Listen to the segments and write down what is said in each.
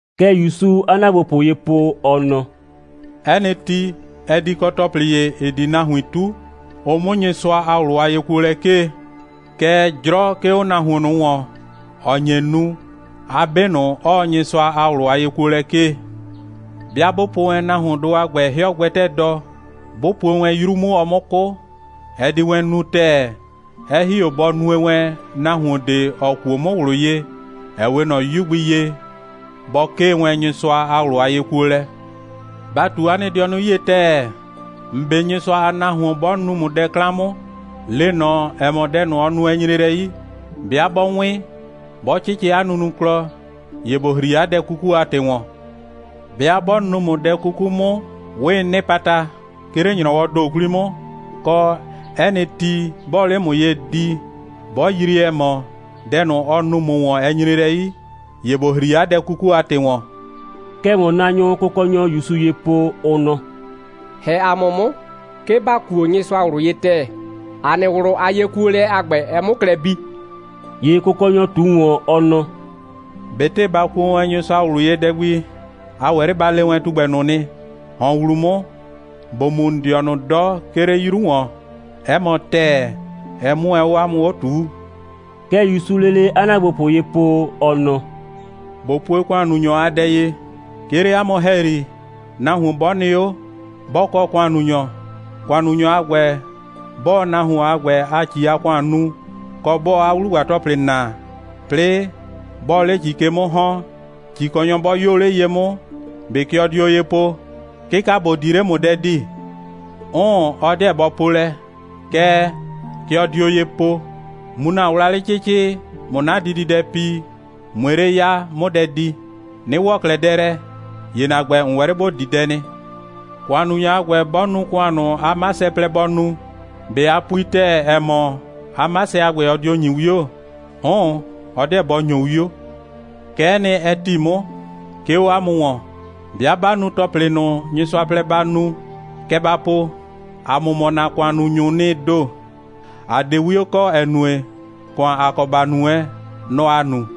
Kɛ ‑Yusuu 'a ‑naagbopʋ ye po, ɔ nɔ: «'Ɛ nɩ ti, ɛ di kɔ ‑tɔplɩ ‑ye, ‑ɩ di nahuin 'tu, ʋ 'mʋ Nyɩsʋa a ꞊wlʋ a yekuolɛ 'kee. Kɛɛ, 'jrɔ 'ke 'o nahuon ꞊nʋ ‑wɔn, ‑ɔ nye nu, 'a 'be ꞊nʋ 'ɔɔ Nyɩsʋa a ꞊wlʋ a yekuolɛ 'kee. 'Bɩa 'bʋ po wɛn nahuondʋ a ‑gbɛ 'hɩɔ gbɛtɛɛ dɔ, 'bʋ puo wɛn 'yru 'mʋ, ɔ 'mʋ 'kʋ, ɛ di wɛn nu ‑tɛɛ, 'ɛ ‑hi 'o bɔ nue wɛn, nahuon ꞊de, ‑ɔ kuo 'mʋ ꞊wlʋ ye, ‑ɛ 'we ꞊nɔ 'yu gbi ye, bɔ 'kee wɛn Nyɩsʋa a ꞊wlʋ a yekuolɛ. Ba ꞊tu 'a nɩ dɩɔnʋ 'yie ‑tɛɛ. ‑N 'be Nyɩsʋa a nahuon 'bɔ nu ‑mʋ dɛ 'klan 'mʋ, le ꞊nɔ, ‑ɛ mɔ, dɛ ꞊nʋ, ɔ nu, ɛ nyre lɛ 'yi. 'Bɩa 'bɔ 'wɩn, 'bɔ 'cɩcɩ 'a nunuklɔ, ‑ye ‑bo ‑hri 'a dɛ 'kuku a ‑tɩ ‑wɔn. 'Bɩa 'bɔ nu ‑mʋ dɛ 'kuku 'mʋ, 'wɩɩ 'nɩpata, 'ke 'le ‑nyrɔwɔɔ ‑do 'kwli 'mʋ, kɔ, 'ɛ nɩ ti, 'bɔɔ 'le ‑mʋ ye di, 'bɔ yrie, ‑ɛ mɔ, dɛ ꞊nʋ, ɔ nu ‑mʋ ‑wɔn, ɛ nyre lɛ 'yi, ‑ye ‑bo ‑hri 'a dɛ 'kuku a ‑tɩ ‑wɔn.» Kɛ ‑wɔnnaanyʋʋ Kʋkɔnyɔ ‑Yusu ye po, ʋ nɔ: «‑Hɛ ‑a mʋ 'mʋ, 'ke ‑ba kuo Nyɩsʋa ꞊wlʋ ye ‑tɛɛ, ‑a nɩ ꞊wlʋ a yekuolɛ a ‑gbɛ, ɛ 'mʋ klɛ bii.» ‑Ye Kʋkɔnyɔ ꞊tu ‑wɔn, ɔ nɔ: «꞊Betɩ ba kuo wɛn Nyɩsʋa ꞊wlʋ ye dɛ gbi, a ‑wɛ 'le ba le wɛn tugbɛ ꞊nʋ nɩ: ‑Hɔn ‑wlu 'mʋ, ‑bo mu ‑n dɩɔnʋ 'dɔ, 'ke 'le 'yru ‑wɔn! 'ɛ mɔ ‑tɛɛ, ɛ 'mʋ wɛn 'o 'a mʋ 'o ꞊tuu.» Kɛ ‑Yusuu lele 'a ‑naagbopʋ ye po, ɔ nɔ: «꞊Bo pue ‑kʋannunyɔ a dɛ ye: 'Ke 'le 'a mʋ ‑hɛyri, nahuon 'bɔ nɩ 'o, 'bɔ kɔ ‑kʋannunyɔ, ‑kʋannunyɔ a ‑gbɛ, 'bɔɔ nahuon a ‑gbɛ a ‑ci a ‑kʋan nu, kɔ, 'bɔɔ 'a 'wlugba‑tɔplɩ naa, 'plɩɩ 'bɔɔ 'le ‑ci ke 'mʋ ‑hɔn, ‑cikɔnyɔ 'bɔ 'yoo 'le ye 'mʋ, ꞊be kɛ ɔ dio ye po: 'Kɩka, ‑bo di 'le, ꞊mʋ dɛ di? 'Ʋʋn, ɔ 'deɛ bɔ po lɛ, kɛɛ, kɛ ɔ dio ye po: Mu ‑na wlawlɩ 'cɩcɩ, ꞊mʋ 'na dididɛ pi, ꞊mue 'le ya, 'mʋ dɛ di. 'Nɩ ‑wɔ 'klɛɛ dɛ lɛ, ‑ye ‑na ‑gbɛ, ‑n ‑wɛ 'le ‑bo di dɛ nɩ. ‑Kʋannunyɔ a ‑gbɛ, 'bɔ nu ‑kʋan ꞊nʋ, 'a 'masɛ plɛ bɔ nu, ꞊be a pui ‑tɛɛ, ‑ɛ mɔ, 'a 'masɛ a ‑gbɛ, ɔ dio ‑nyi 'wio? 'Ʋʋn, ɔ 'deɛ bɔ ‑nyo 'wio. Kɛ'ɛ nɩ, ɛ ‑ti 'mʋ, 'ke 'o 'a mʋ ‑wɔn: 'Bɩa 'ba nu ‑tɔplɩ 'bii ꞊nʋ, Nyɩsʋa plɛ ba nu, kɛ ba po: ‑A mʋ mɔ ‑na ‑kʋannunyʋʋ nɩ ‑do. ‑A 'de 'wio kɔ, ‑ɛ nue, ‑kʋan, ‑a kɔ ‑ba nu wɛn, nɔ‑ ‑a nu.»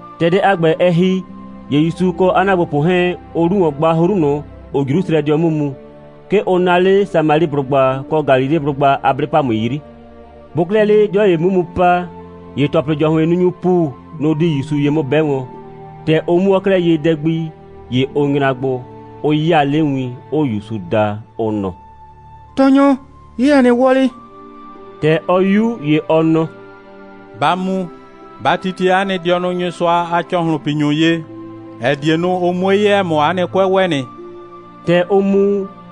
‑Tɛ dɛ a ‑gbɛ, ɛ ‑hi, ‑ye ‑Yusu kɔ 'a ‑naagbopʋ 'hɛɛn, ʋʋ 'lu ‑wɔn gba 'hru ꞊nʋ, ‑ʋʋ Jrusrɛdɩɔ 'mʋ mu. 'Ke ʋ naa 'le Samaliblʋgba kɔ Galileblʋgba a 'blɩ‑pamʋɩ 'yri. Bʋʋ 'klɛɛ 'le 'dɩɔ ‑ye 'mʋ mu pa, ‑ye ‑tɔplɩ‑jɔhʋɩnnunyʋʋ ‑pu, nʋ‑ di ‑Yusu ye 'mʋ 'bɛ wɔn. ‑Tɛ ʋ 'mʋɔɔ 'klɛɛ ye dɛ gbi, ‑ye ʋ nyra gbo, 'ʋ 'yaa 'le win, 'ʋʋ ‑Yusu da, ʋ nɔ: «Tɔɔnyɔ, 'ye ‑a nɩ wɔlɩ!» ‑Tɛ ɔ 'yu, ‑ye ɔ nɔ: «Ba mu, ba titie 'a nɩ dɩɔnʋ Nyɩsʋa a ‑cɔhlʋnpinyʋ ye, ‑ɛ die nu, ʋ 'mue 'ye, ‑ɛ mɔ, 'a nɩ 'kʋɛ ‑wɛ nɩ.» ‑Tɛ ʋʋ mu,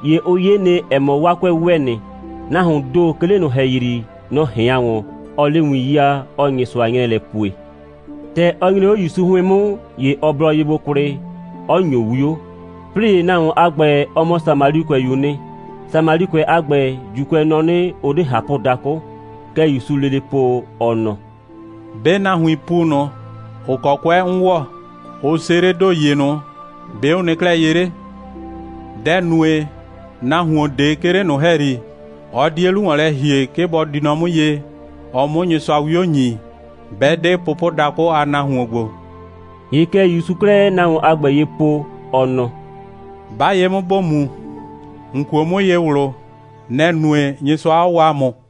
‑ye ʋ 'ye nɩ, ‑ɛ mɔ, 'waa 'kʋɛ ‑wɛ nɩ. Nahuoon ‑do, 'ke 'le ꞊nʋ ‑hɛyri, nɔ‑ ꞊hɩan ‑wɔn, 'ɔɔ 'le win 'yaa, 'ɔɔ Nyɩsʋa 'nyrɛɛ lɛ pue. ‑Tɛ ɔ nyre 'o ‑Yusu 'hʋɩn 'mʋ, ‑ye ɔ blɔ ye gbo kwlɩ, 'ɔ ‑nyo 'wio. 'Plɩɩ ‑ye nahuon a ‑gbɛ, ɔ mɔ Samalikʋɛyu'u nɩ. (Samalikʋɛ a ‑gbɛ, ‑Juukʋɛ nɔ 'nɩ, ʋ 'de ꞊hapʋdakʋ.) Kɛ ‑Yusuu lele po, ɔ nɔ: «'Be nahuiin ‑pu ꞊nʋ, ‑ʋ kɔ 'kʋɛ 'n ‑wɔ, ʋ seledo ‑ye ꞊nʋ, ‑be' ʋ nɩ 'klɛɛ ye 'le? Dɛ‑ nue, nahuon ꞊de 'ke 'le ꞊nʋ ‑hɛyri, ɔ 'die 'lu ‑wɔn lɛ ‑hie, 'ke bɔ di nɔ 'mʋ ye, ɔ 'mʋ Nyɩsʋa 'wio ‑nyi, 'bɛ 'de pʋpʋdakʋ a nahuon ‑gbo?» ‑Ye kɛ ‑Yusuu 'klɛɛ nahuon a ‑gbɛ ye po, ɔ nɔ: «'Ba ye 'mʋ, ‑bo mu. ‑N kuo 'mʋ ye ꞊wlʋ, nɛ‑ nue, Nyɩsʋa 'ɔ waa ‑mʋ.»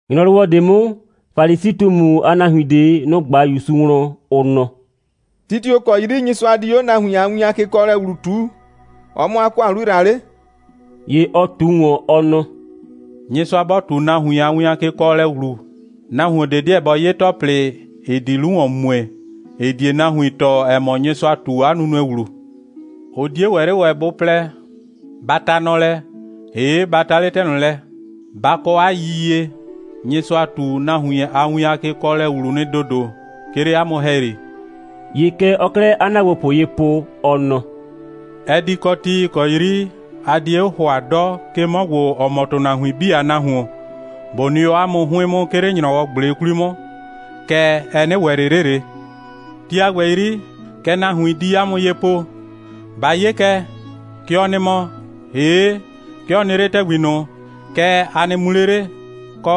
‑Nyrɔwɔ ꞊de 'mʋ, Falisi꞊tumu a nahuin ꞊de, nʋ‑ ꞊gba ‑Yusu wlɔn, ʋ nɔ: «Ti tio‑ kɔ 'yri Nyɩsʋa di 'o nahuin a win a kekɔɔlɛ ‑wlu ꞊tuu, ɔ 'mʋ 'a ‑kʋan 'lu ‑yra 'le?» ‑Ye ɔ ꞊tu ‑wɔn, ɔ nɔ: «Nyɩsʋa 'bɔ ꞊tu nahuin a win a kekɔɔlɛ ‑wlu, nahuon ꞊de 'deɛ bɔ 'ye ‑tɔplɩ, ‑ɩ di 'lu ‑wɔn mue, ‑ɩ die nahuin tɔɔ, ‑ɛ mɔ, Nyɩsʋa ꞊tu 'a nunue ‑wlu. Ʋ 'die ‑wɛ 'le ‑wɛ bʋ plɛ: Ba ta nɔ lɛ, ‑hee', ba ta 'le ‑tɛ ꞊nʋ lɛ. Ba kɔ 'a yiyie, Nyɩsʋa ꞊tu nahuin a win a kekɔɔlɛ ‑wlu nɩ ‑dodo, 'ke 'le 'a mʋ ‑hɛyri.» ‑Ye kɛ ɔɔ 'klɛɛ 'a ‑naagbopʋ ye po, ɔ nɔ: «Ɛ di kɔ ti, ‑ɩ kɔ 'yri a die 'o ‑hʋa 'dɔ, 'ke 'mɔ ‑gbo, ‑ɔ mɔ ‑tʋnahuin 'bii a Nahuon, ꞊bo nɩ 'o 'a mʋ 'hʋɩn 'mʋ, 'ke 'le ‑nyrɔwɔ꞊gble 'kwli 'mʋ, kɛɛ, ɛ 'nɩ ‑wɛ ꞊le 'le ꞊le. Ti a ‑gbɛ 'yri, kɛ nahuin di 'a mʋ ye po: Ba 'ye kɛ, kɛ ɔ nɩ mɔ, ‑hee', 'ke ɔ nɩ 'le ‑tɛgbi ꞊nʋ, kɛɛ, a nɩ mu 'le 'le, kɔ,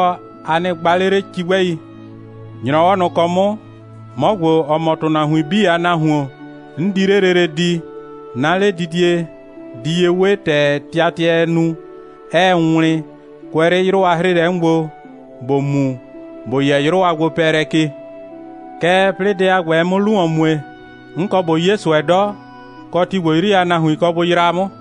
a nɩ gba 'le 'le cigbɛi. ‑Nyrɔwɔ ꞊nʋ ‑kɔ 'mʋ, 'mɔ ‑gbo, ‑ɔ mɔ ‑tʋnahuin 'bii a Nahuon, 'n di 'le lele di, 'na 'ledidie di ye 'we ‑tɛ tɩatɩɛɛ nu, 'ɛɛ wlɩn, kʋɛ 'le 'yrʋ a 'hrɩɩlɛ 'mʋ gbo, ‑bo mu, ‑bo yɛ 'yrʋ a gbopɛɛlɛ ke. Kɛɛ, 'plɩɩ dɛ a ‑gbɛ, ɛ 'mʋ 'lu ‑wɔn mue, 'n kɔ ꞊bo 'ye ꞊sʋɛ 'dɔ, kɔ, ti ‑gbo 'yri a nahuin kɔ bʋ yraa 'mʋ.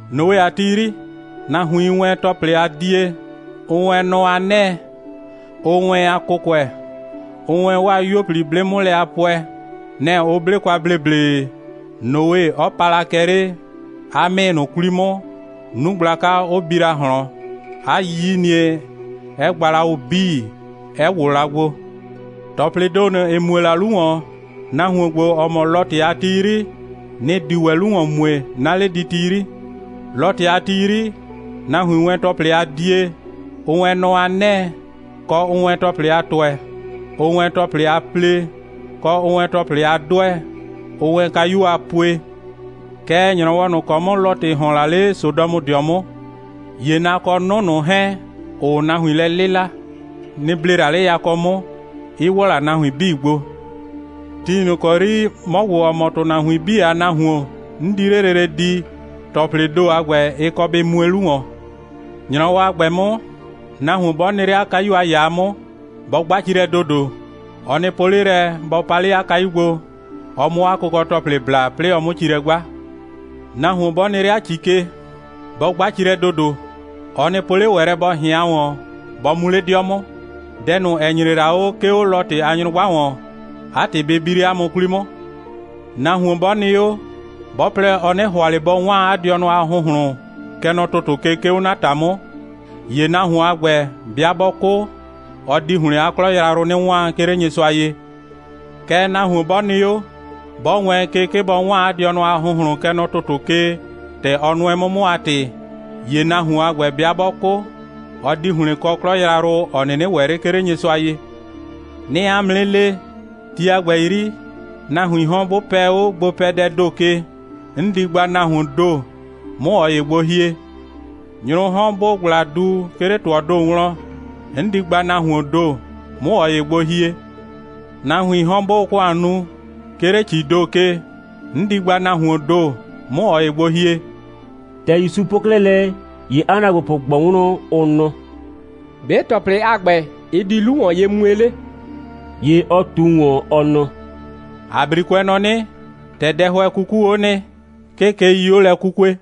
Noe a ti 'yri, nahuiin wɛn ‑tɔplɩ a die, ʋʋ wɛn nɔ a 'nɛɛ, ʋʋ wɛn a kʋkʋɛ, ʋʋ wɛn 'waa 'yuo 'blɩ 'mʋ lɛ a pʋɛ. Nɛ‑ ʋ 'ble kwa ‑bleble, Noe 'ɔ pa la kɛ 'le 'a 'mɩɩ ꞊nʋ 'kwli 'mʋ, 'nu gblaka 'ʋ bi la ꞊hlɔn, 'a 'yiyinie 'ɛ gba la ʋ 'bii, 'ɛ ‑wʋ la gbo. ‑Tɔplɩɩ ‑do ꞊nʋ, ‑ɩ mue la 'lu ‑wɔn, nahuon ‑gbo, ‑ɔ mɔ Lɔtɩ a ti 'yri, nɩ‑ di ‑wɛ 'lu ‑wɔn mue, 'na 'lediti 'yri. Lɔtɩ a ti 'yri, nahuiin wɛn ‑tɔplɩ a die, ʋʋ wɛn nɔ a 'nɛɛ, kɔ, ʋʋ wɛn ‑tɔplɩ a ‑tʋɛ, ʋʋ wɛn ‑tɔplɩ a plee, kɔ, ʋʋ wɛn ‑tɔplɩ a 'dʋɛ, ʋʋ wɛn kayuo a pue. Kɛɛ, ‑nyrɔwɔ ꞊nʋ ‑kɔ 'mʋ Lɔtɩ ‑hɔn la 'le Sodɔmʋdɩɔ 'mʋ, ‑ye na kɔ 'nʋ ꞊nʋ 'hɛɛn, ‑ʋʋ nahuin lɛ 'lɩla, nɩ‑ ble la 'le yakɔ 'mʋ, 'ɩ ‑wɔ la nahuin 'bii gbo. Ti ꞊nʋ ‑kɔ 'yri, 'mɔ ‑gbo, ‑ɔ mɔ ‑tʋnahuin 'bii a Nahuon, 'n di 'le lele di, ‑tɔplɩɩ ‑do a ‑gbɛ, ɩ kɔ bɩ mue 'lu ‑wɔn. ‑Nyrɔwɔ a ‑gbɛ 'mʋ, nahuon 'bɔ nɩ 'le 'a kayu a ‑yaa 'mʋ, bɔ 'gba ci lɛ ‑dodo. Ɔ nɩ po 'le lɛ, bɔ pa 'le 'a kayu gbo, ɔ 'mʋ 'a kʋkɔ‑tɔplɩ bla, 'plɩɩ ɔ 'mʋ ci lɛ 'gba. Nahuon 'bɔ nɩ 'le 'a ‑ci ke, bɔ 'gba ci lɛ ‑dodo. Ɔ nɩ po 'le ‑wɛ lɛ, bɔ ꞊hɩan ‑wɔn, bɔ mu 'le 'dɩɔ 'mʋ. Dɛ ꞊nʋ, ‑ɛ nyre la 'o, 'ke 'o Lɔtɩ a nyrʋgba ‑wɔn, 'a ‑tɩ bɩ bi 'le 'a mʋ 'kwli 'mʋ. Nahuon 'bɔ nɩ 'o, 'bɔ plɛ, ɔ 'nɩ ‑hʋa ꞊le bɔ 'waan 'a dɩɔnʋ a ‑hʋnhlʋn, kɛ nɔ ‑tʋtʋ ke, 'ke 'o 'na ‑ta 'mʋ, ‑ye nahuon a ‑gbɛ, 'bɩa 'bɔ 'kʋ, ɔ di ‑hlɩn 'a 'klɔ yrayrʋ 'nɩ 'waan, 'ke 'le Nyɩsʋa ye. Kɛɛ, nahuon 'bɔ nɩ 'o, 'bɔ wɛɛn ke, 'ke bɔ 'waan 'a dɩɔnʋ a ‑hʋnhlʋn, kɛ nɔ ‑tʋtʋ ke, ‑tɛ ɔ nʋɛ 'mʋ 'mʋ a ‑tɩ, ‑ye nahuon a ‑gbɛ, 'bɩa 'bɔ 'kʋ, ɔ di ‑hlɩn kɔ 'klɔ yrayrʋ, ‑ɔ 'nɩnɩ ‑wɛ 'le, 'ke 'le Nyɩsʋa ye. 'Nɩɩ 'a mʋ 'nɩ le, ti a ‑gbɛ 'yri, nahuiin 'hɔn 'bʋ pɛ 'o gbopɛdɛɛ ‑do ke, 'n di gba nahuoon ‑do, 'mʋ ꞊ɔ ‑ye gbo hie. Nyrʋʋ 'hɔn 'bʋʋ ꞊gbla du, 'ke 'le ‑tʋɔɔ ‑do wlɔn, 'n di gba nahuoon ‑do, 'mʋ ꞊ɔ ‑ye gbo hie. [ Nahuiin 'hɔn, 'bʋʋ ‑kʋan nu, 'ke 'le ‑cii ‑do ke, 'n di gba nahuoon ‑do, 'mʋ ꞊ɔ ‑ye gbo hie.]» ‑Tɛ ‑Yusu po 'klɛɛ lɛ, ‑ye 'a ‑naagbopʋ ꞊gbɔ wlɔn, ʋ nɔ: «‑Be' ‑tɔplɩ a ‑gbɛ, ɩ di 'lu ‑wɔn ye mue 'le?» ‑Ye ɔ ꞊tu ‑wɔn, ɔ nɔ: «‑A 'brikʋɛ nɔ 'nɩ: ‑Tɛ dɛhʋɛ 'kukuu 'o nɩ, 'ke keii 'o lɛ 'kukue.»